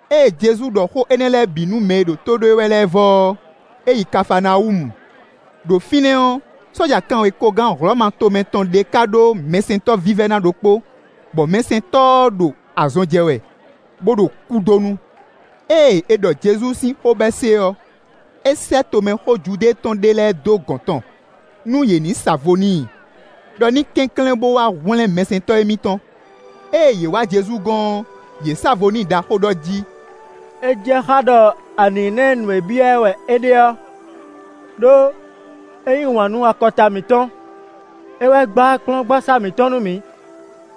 Ée Jezu ɖɔ xó énɛ́ lɛ́ɛ bǐ nú mɛ e ɖo tó ɖó e wɛ lɛ́ɛ vɔ ɔ́, é yi Kafaanawúmu. Đo fínɛ́ ɔ́, sɔ́ja kanwekogán Hlɔ̌ma tomɛ tɔn ɖé ka ɖó mɛsɛntɔ́ vívɛ́ná ɖokpó, bɔ mɛsɛntɔ́ ɔ́ ɖo azɔn jɛ wɛ, bó ɖo kúdonu. Ée è ɖɔ Jezu sín xó bɔ é se ɔ́, é sɛ́ tomɛxó Judée tɔn ɖé lɛ́ɛ dó gɔ̌n tɔn, nú yě ní sa vo n'i ɖɔ ní kɛnklɛ́n bó wá hwlɛ́n mɛsɛntɔ́ émítɔn. Ée yě wá Jezu gɔ́n ɔ́, yě sa vo n'i ɖaxó ɖɔ jí: “É jɛ xá ɖɔ a nǐ ná ɛ nǔ e byɔ́ wɛ é ɖe ɔ́, ɖó é yí wǎn nú akɔta mǐtɔn; é wɛ gbá kplɔ́ngbasá mǐtɔn nú mǐ.”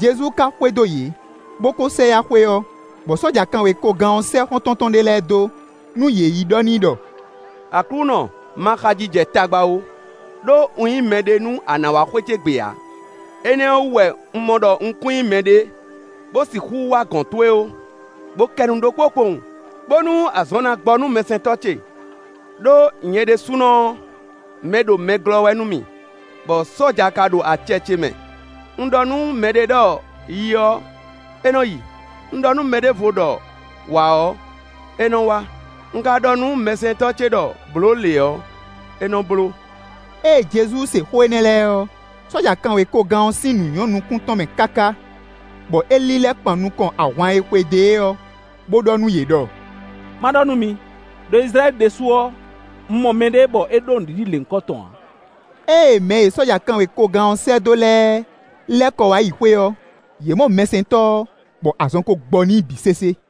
Jezu ka xwedó yě, bó kó sɛ yá xwé ɔ́, bɔ sɔ́ja kanwekogán ɔ́ sɛ́ xɔ́ntɔn tɔn ɖé lɛ́ɛ dó, nú yě yi ɖɔ n'i ɖɔ: “Aklúnɔ, ma xaji jɛ tagba ó, ɖó un nyí mɛɖé nú a nǎ wá xwé ce gbe ǎ. Énɛ́ ɔ́ wú wɛ un mɔ ɖɔ un kún nyí mɛɖé, bó sixú wá gɔ̌n towe ó. Bo kɛ nu ɖokpó kpowun, bónú azɔn ná gbɔ nú mɛsɛntɔ́ ce. Đó nyɛ ɖésúnɔ ɔ́, mɛɖomɛglɔ́ wɛ nú mì, bɔ sɔ́ja ka ɖo acɛ ce mɛ; un ɖɔ nú mɛ ɖě ɖɔ: ‘Yi’ ɔ́, é nɔ́ yi; un ɖɔ nú mɛ ɖěvo ɖɔ: ‘Wǎ’ ɔ́, é nɔ wá; un ka ɖɔ nú mɛsɛntɔ́ ce ɖɔ: ‘Blǒ lě’ ɔ́, é nɔ́ bló.” Ée Jezu se xó énɛ́ lɛ́ɛ ɔ́, sɔ́ja kanwekogán ɔ́ sín nǔ nyɔ́ nukún tɔn mɛ káká, bɔ é lílɛ́ kpan nukɔn ahwan e xwedó e ɔ́, bó ɖɔ nú yě ɖɔ: “Ma ɖɔ nú mi, ɖo Izlayɛ́li ɖésú ɔ́, un mɔ mɛɖé, bɔ é ɖó nǔɖiɖi lěhunkɔtɔn ǎ.” Ée mɛ e sɔ́ja kanwekogán ɔ́ sɛ́ dó lɛ́ɛ lɛ́ kɔ wá yi xwé ɔ́, yě mɔ mɛsɛntɔ́ ɔ́, bɔ azɔn ko gbɔ n'i bǐ sésé.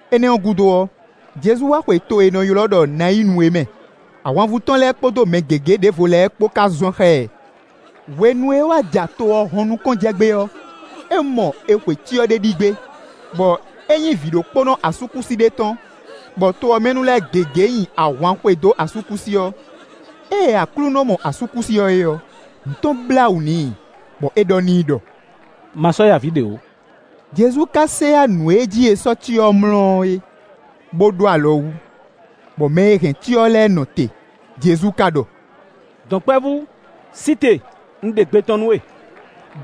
Énɛ́ gúdo ɔ́, Jezu wá xwe to e è nɔ ylɔ́ ɖɔ Nayinu é mɛ. Ahwanvú tɔn lɛ́ɛ kpódó mɛ gěgé ɖěvo lɛ́ɛ kpó ka zɔn xá ɛ. Hwenu e é wá ja to ɔ́ hɔn nukɔn jɛ gbé ɔ́, é mɔ è xwe cyɔ ɖé ɖi gbé, bɔ é nyí vǐɖokpónɔ asúkúsi ɖé tɔn, bɔ to ɔ́ mɛ nu lɛ́ɛ gěgé nyi ahwan xwedó asúkúsi ɔ́. Ée Aklúnɔ mɔ asúkúsi ɔ́ é ɔ́, nǔ tɔn blá wǔ n'i, bɔ é ɖɔ n'i ɖɔ: “Ma sɔ́ ya avǐ ɖě ó.” Jezu ka sɛ yá nǔ e jí è sɔ́ cyɔ ɔ́ mlɔ́ é, bó ɖó alɔ wú, bɔ mɛ e hɛn cyɔ ɔ́ lɛ́ɛ nɔ te. Jezu ka ɖɔ: “Dɔ̌nkpɛvú, sí te, un ɖe gbe tɔn nú we.”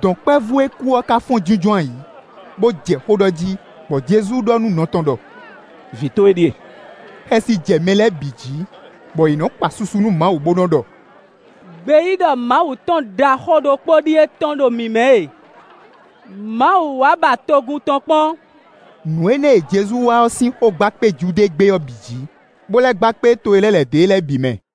Dɔ̌nkpɛvú e kú ɔ́ ka fɔ́n jínjɔ́n ayǐ, bó jɛ xó ɖɔ jí, bɔ Jezu ɖɔ nú nɔ tɔn ɖɔ: “Vǐ towe ɖíe.” Xɛsi jɛ mɛ lɛ́ɛ bǐ jí, bɔ yě nɔ kpa susu nú Mawu, bó nɔ́ ɖɔ: “Gbeyíɖɔ Mawu tɔn ɖaxó ɖokpó ɖíe tɔ́n ɖo mǐ mɛ e; Mawu wá ba togun tɔn kpɔ́n.” Nǔ énɛ́ e Jezu wa ɔ́ sín xó gba kpé Judée gbé ɔ́ bǐ jǐ, bó lɛ́ gba kpé to e lɛ́ lɛ̌ dó e lɛ́ɛ bǐ mɛ.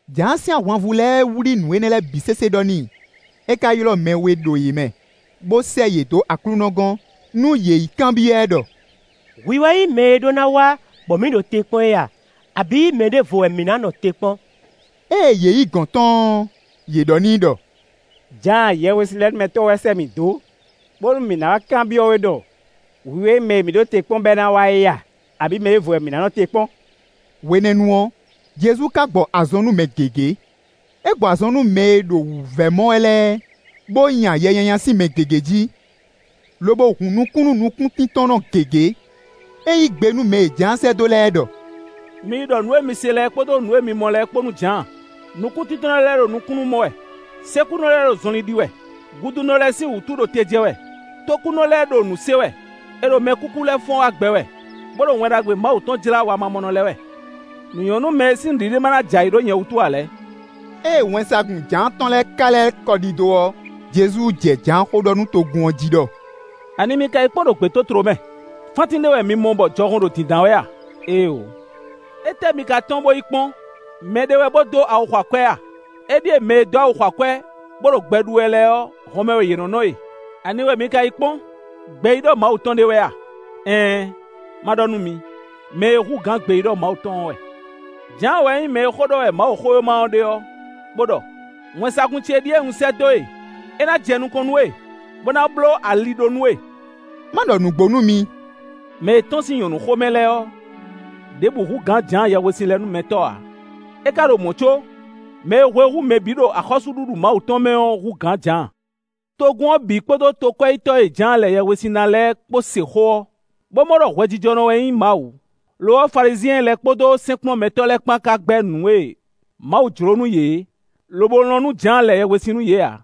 Jǎan sín ahwanvú lɛ́ɛ wlí nǔ énɛ́ lɛ́ɛ bǐ sésé ɖɔ n'i; é ka ylɔ́ mɛ we ɖo yě mɛ, bó sɛ́ yě dó Aklúnɔ gɔ́n, nú yě yi kanbyɔ́ ɛ ɖɔ: “Hwi wɛ nyí mɛ e ɖó ná wá, bɔ mǐ ɖo te kpɔ́n é a, abǐ mɛ ɖěvo wɛ mǐ ná nɔ te kpɔ́n?” Ée yě yi gɔ̌n tɔn ɔ́, yě ɖɔ n'i ɖɔ: “Jǎan Yɛhwesinlɛnúmɛtɔ́ wɛ sɛ́ mǐ dó, bónú mǐ ná wá kanbyɔ́ we ɖɔ: ‘Hwi wɛ nyí mɛ e mǐ ɖo te kpɔ́n bɔ é ná wá é a, abǐ mɛ ɖěvo wɛ mǐ ná nɔ te kpɔ́n?’” Hwenɛ́nu ɔ́, Jezu ka gbɔ azɔn nú mɛ gěgé; é gbɔ azɔn nú mɛ e ɖo wǔvɛ́ mɔ wɛ lɛ́ɛ, bó nya yɛ nyanya sín mɛ gěgé jí, lobo hun nukún nú nukúntíntɔ́nnɔ gěgé. É yí gbe nú mɛ e Jǎan sɛ́ dó lɛ́ɛ ɖɔ: “Mi yi ɖɔ nǔ e mi se lɛ́ɛ kpódó nǔ e mi mɔ lɛ́ɛ kpó nú Jǎan: nukúntíntɔ́nnɔ lɛ́ɛ ɖo nukúnnú mɔ wɛ, sékúnɔ lɛ́ɛ ɖo zɔnlin ɖi wɛ, gudunɔ lɛ́ɛ sín wǔtu ɖo te jɛ wɛ, tókúnɔ lɛ́ɛ ɖo nǔ se wɛ, è ɖo mɛkúkú lɛ́ɛ fɔ́n wá gbɛ wɛ, bó ɖo Wɛn Ɖagbe Mawu tɔn jlá wamamɔnɔ lɛ́ɛ wɛ. Nǔ nyɔ́ nú mɛ e sín nǔɖiɖi ma ná jɛ ayǐ ɖó nyɛ wútu ǎ lɛ́ɛ.” Ée wɛnsagun Jǎan tɔn lɛ́ɛ ka lɛ́ kɔ ɖidó ɔ́, Jezu jɛ Jǎan xó ɖɔ nú togun ɔ́ jí ɖɔ: “Ani mi ka yi kpɔ́n ɖo gbětótló mɛ? Fántín ɖé wɛ mi mɔ bɔ jɔhɔn ɖo dǐndán wɛ a? Éeǒ. Étɛ́ mi ka tɔ́n bó yi kpɔ́n? Mɛ ɖé wɛ bó dó awu xɔ akwɛ́ a? Éɖíe mɛ e nɔ dó awu xɔ akwɛ́, bó nɔ́ ɖo gbɛ ɖu wɛ lɛ́ɛ ɔ́, hɔnmɛ wɛ yě nɔ́ nɔ e. Ani wɛ mi ka yi kpɔ́n? Gbeyíɖɔ Mawu tɔn ɖé wɛ a? Ɛɛn! Ma ɖɔ nú mi, mɛ e hú gbeyíɖɔ Mawu tɔn ɔ́ wɛ. Jǎan wɛ nyí mɛ e xó ɖɔ wɛ Mawuxówéma ɖe ɔ́, bó ɖɔ: ‘Wɛnsagun ce ɖíe un sɛ́ dó e, é ná jɛ nukɔn nú we, bó ná bló ali ɖó nú we.’” Má ɖɔ nǔgbó nú mi: “Mɛ e tɔ́n sín nyɔ̌nu xo mɛ lɛ́ɛ ɔ́, ɖěbǔ hú gǎn Jǎan Yɛhwesinlɛnúmɛtɔ́ ǎ; é ka ɖo mɔ̌ có mɛ e hwe hú mɛ bǐ ɖo axɔ́súɖuɖu Mawu tɔn mɛ ɔ́ hú gǎn Jǎan. Togun ɔ́ bǐ kpódó tokwɛ́yítɔ́ e Jǎan lɛ yɛhwesin ná lɛ́ɛ kpó se xó ɔ́, bó mɔ ɖɔ hwɛjijɔnɔ wɛ nyí Mawu. Lo ɔ́, Falizyɛn lɛ́ɛ kpódó sɛ́nkplɔ́nmɛtɔ́ lɛ́ɛ kpán ka gbɛ́ nǔ e Mawu jló nú yě é, lobo lɔn nú Jǎan lɛ yɛhwesin nú yě ǎ.”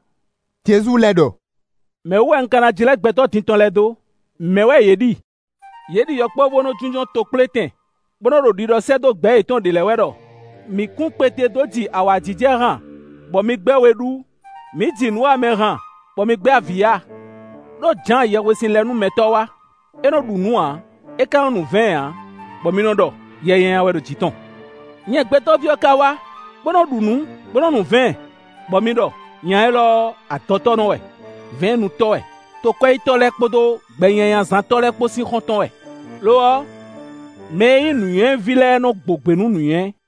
Jezu lɛ́ ɖɔ: “Mɛ̌ wú wɛ un ka ná jlɛ́ gbɛtɔ́ din tɔn lɛ́ɛ dó? Mɛ̌ wɛ yě ɖi? Yě ɖi yɔkpɔ́vú e nɔ jínjɔ́n tokplétɛn bó nɔ́ ɖo ɖiɖɔ sɛ́ dó gbɛ̌ yětɔn ɖě lɛ́ɛ wɛ ɖɔ: ‘Mǐ kún kpete dó ji awǎjijɛ han, bɔ mi gbɛ́ we ɖú; mǐ ji nǔwamɛ han, bɔ mi gbɛ́ avǐ ya.’ Đó Jǎan Yɛhwesinlɛnúmɛtɔ́ wá, é nɔ ɖu nǔ ǎ, é ka nɔ nu vɛ̌ɛn ǎ, bɔ mi nɔ ɖɔ: ‘Yɛ nyanya wɛ ɖo jǐ tɔn.’ Nyɛ Gbɛtɔ́ví ɔ́ ká wá, bó nɔ́ ɖu nǔ, bó nɔ́ nu vɛ̌ɛn, bɔ mi ɖɔ: ‘Nya élɔ́ ɔ́, adɔtɔ́nɔ wɛ, vɛ̌ɛnnutɔ́ wɛ, tokwɛ́yítɔ́ lɛ́ɛ kpódó gbɛnyanyazántɔ́ lɛ́ɛ kpó sín xɔ́ntɔn wɛ.’ Lo ɔ́, mɛ e nyí nǔnywɛ́ ví lɛ́ɛ nɔ́ gbo gbě nú nǔnywɛ́.”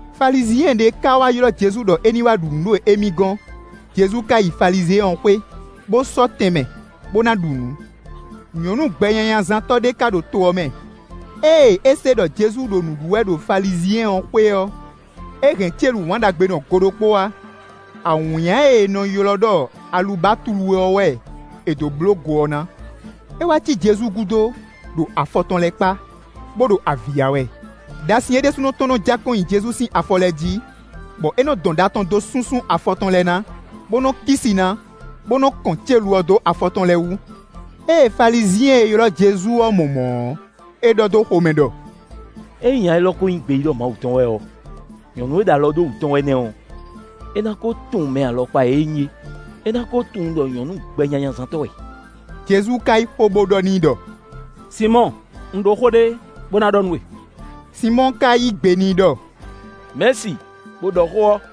Falizyɛn ɖé ka wá ylɔ́ Jezu ɖɔ é ní wá ɖu nǔ ɖo émí gɔ́n. Jezu ka yi Falizyɛn ɔ́ xwé, bó sɔ́ tɛnmɛ, bó ná ɖu nǔ. Nyɔ̌nu gbɛnyanyazántɔ́ ɖé ka ɖo to ɔ́ mɛ; ée é se ɖɔ Jezu ɖo nǔ ɖu wɛ ɖo Falizyɛn ɔ́ xwé ɔ́, é hɛn célu wǎnɖagbenɔ go ɖokpó wá. Awǐnnya e è nɔ ylɔ́ ɖɔ alubatlu ɔ́ wɛ è dǒ bló go ɔ́ ná. É wá cí Jezu gúdo, ɖo afɔ tɔn lɛ́ɛ kpá, bó ɖo avǐ ya wɛ. Đasin é ɖésúnɔ tɔn nɔ ja kɔn nyi Jezu sin afɔ lɛ́ɛ jí, bɔ é nɔ́ dɔn ɖa tɔn dó súnsún afɔ tɔn lɛ́ɛ ná, bó nɔ́ kí si ná, bó nɔ́ kɔn célu ɔ́ dó afɔ tɔn lɛ́ɛ wú. Ée Falizyɛn e ylɔ́ Jezu ɔ́ mɔ mɔ̌ ɔ́, é ɖɔ dó xomɛ ɖɔ: “Ényí nya élɔ́ ko nyí gbeyíɖɔ Mawu tɔn wɛ ɔ́, nyɔ̌nu e ɖo alɔ ɖó wǔ tɔn wɛ nɛ́ ɔ́, é ná kó tunwun mɛ alɔkpa e é nyí é; é ná kó tunwun ɖɔ nyɔ̌nu gbɛnyanyazántɔ́ wɛ.” Jezu ka yí xó, bó ɖɔ n'i ɖɔ: “Sinmɔ́ɔ, un ɖó xó ɖé bó ná ɖɔ nú we.” Sinmɔ́ɔ ka yí gbe n'i ɖɔ: “Mɛ̌si, bo ɖɔ xó ɔ́.”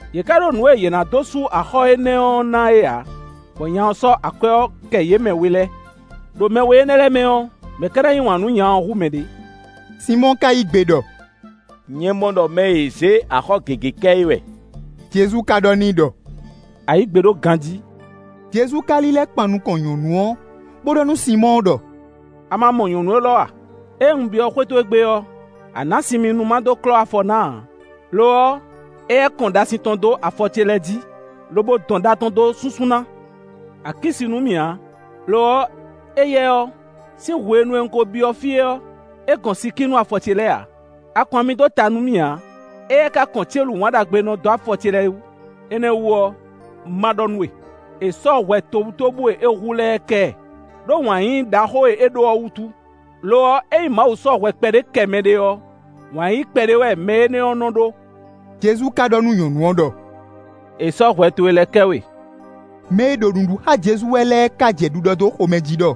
Yě ká ɖó nǔ e yě ná dó sú axɔ́ énɛ́ ɔ́ ná é ǎ, bɔ nya ɔ́ sɔ́ akwɛ́ ɔ́ kɛ yě mɛ we lɛ́ɛ. Đo mɛ we énɛ́ lɛ́ɛ mɛ ɔ́, mɛ̌ ka ná yí wǎn nú nya ɔ́ hú mɛ ɖě?” Sinmɔ́ɔ ka yí gbe ɖɔ: “Nyɛ mɔ ɖɔ mɛ e é zě axɔ́ gěgé kɛ é wɛ.” Jezu ka ɖɔ n'i ɖɔ: “A yǐ gbe ɖó ganjí.” Jezu ka lílɛ́ kpan nukɔn nyɔ̌nu ɔ́, bó ɖɔ nú Sinmɔ́ɔ ɖɔ: “A ma mɔ nyɔ̌nu élɔ́ a? Ée un byɔ́ xwé towe gbe ɔ́, a nǎ sin mì nú má dó klɔ́ afɔ ná ǎ, lo ɔ́, éyɛ́ kɔn ɖasin tɔn dó afɔ ce lɛ́ɛ jí, lobo dɔn ɖa tɔn dó súnsún ná. A kí si nú mì ǎ, lo ɔ́, éyɛ́ ɔ́, sín hwenu e un ko byɔ́ fí ɔ́, é gɔn si kí nú afɔ ce lɛ́ɛ ǎ. A kɔn ami dó ta nú mì ǎ, éyɛ́ ka kɔn célu wǎnɖagbenɔ dó afɔ ce lɛ́ɛ wú. Énɛ́ ɔ́ wú ɔ́, ma ɖɔ nú we: è sɔ́ hwɛ tobutóbú e é hu lɛ́ɛ kɛ ɛ, ɖó wǎn yíyí ɖaxó e é ɖó ɔ́ wútu. Lo ɔ́, ényí Mawu sɔ́ hwɛ kpɛɖé kɛ mɛɖé ɔ́, wǎn yíyí kpɛɖé wɛ mɛ énɛ́ ɔ́ nɔ́ ɖó.” Jezu ka ɖɔ nú nyɔ̌nu ɔ́ ɖɔ: “È sɔ́ hwɛ towe lɛ́ɛ kɛ we.” Mɛ e ɖo nǔ ɖu xá Jezu wɛ lɛ́ɛ ka jɛ ɖiɖɔ dó xomɛ jí ɖɔ: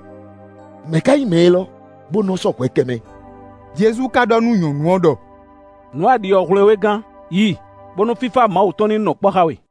“Mɛ̌ ka nyí mɛ élɔ́, bó nɔ́ sɔ́ hwɛ kɛ mɛ?” Jezu ka ɖɔ nú nyɔ̌nu ɔ́ ɖɔ: “Nǔ e a ɖi ɔ́ hwlɛ́n we gán. Yi, bónú fífá Mawu tɔn ní nɔ kpɔ́ xá we.”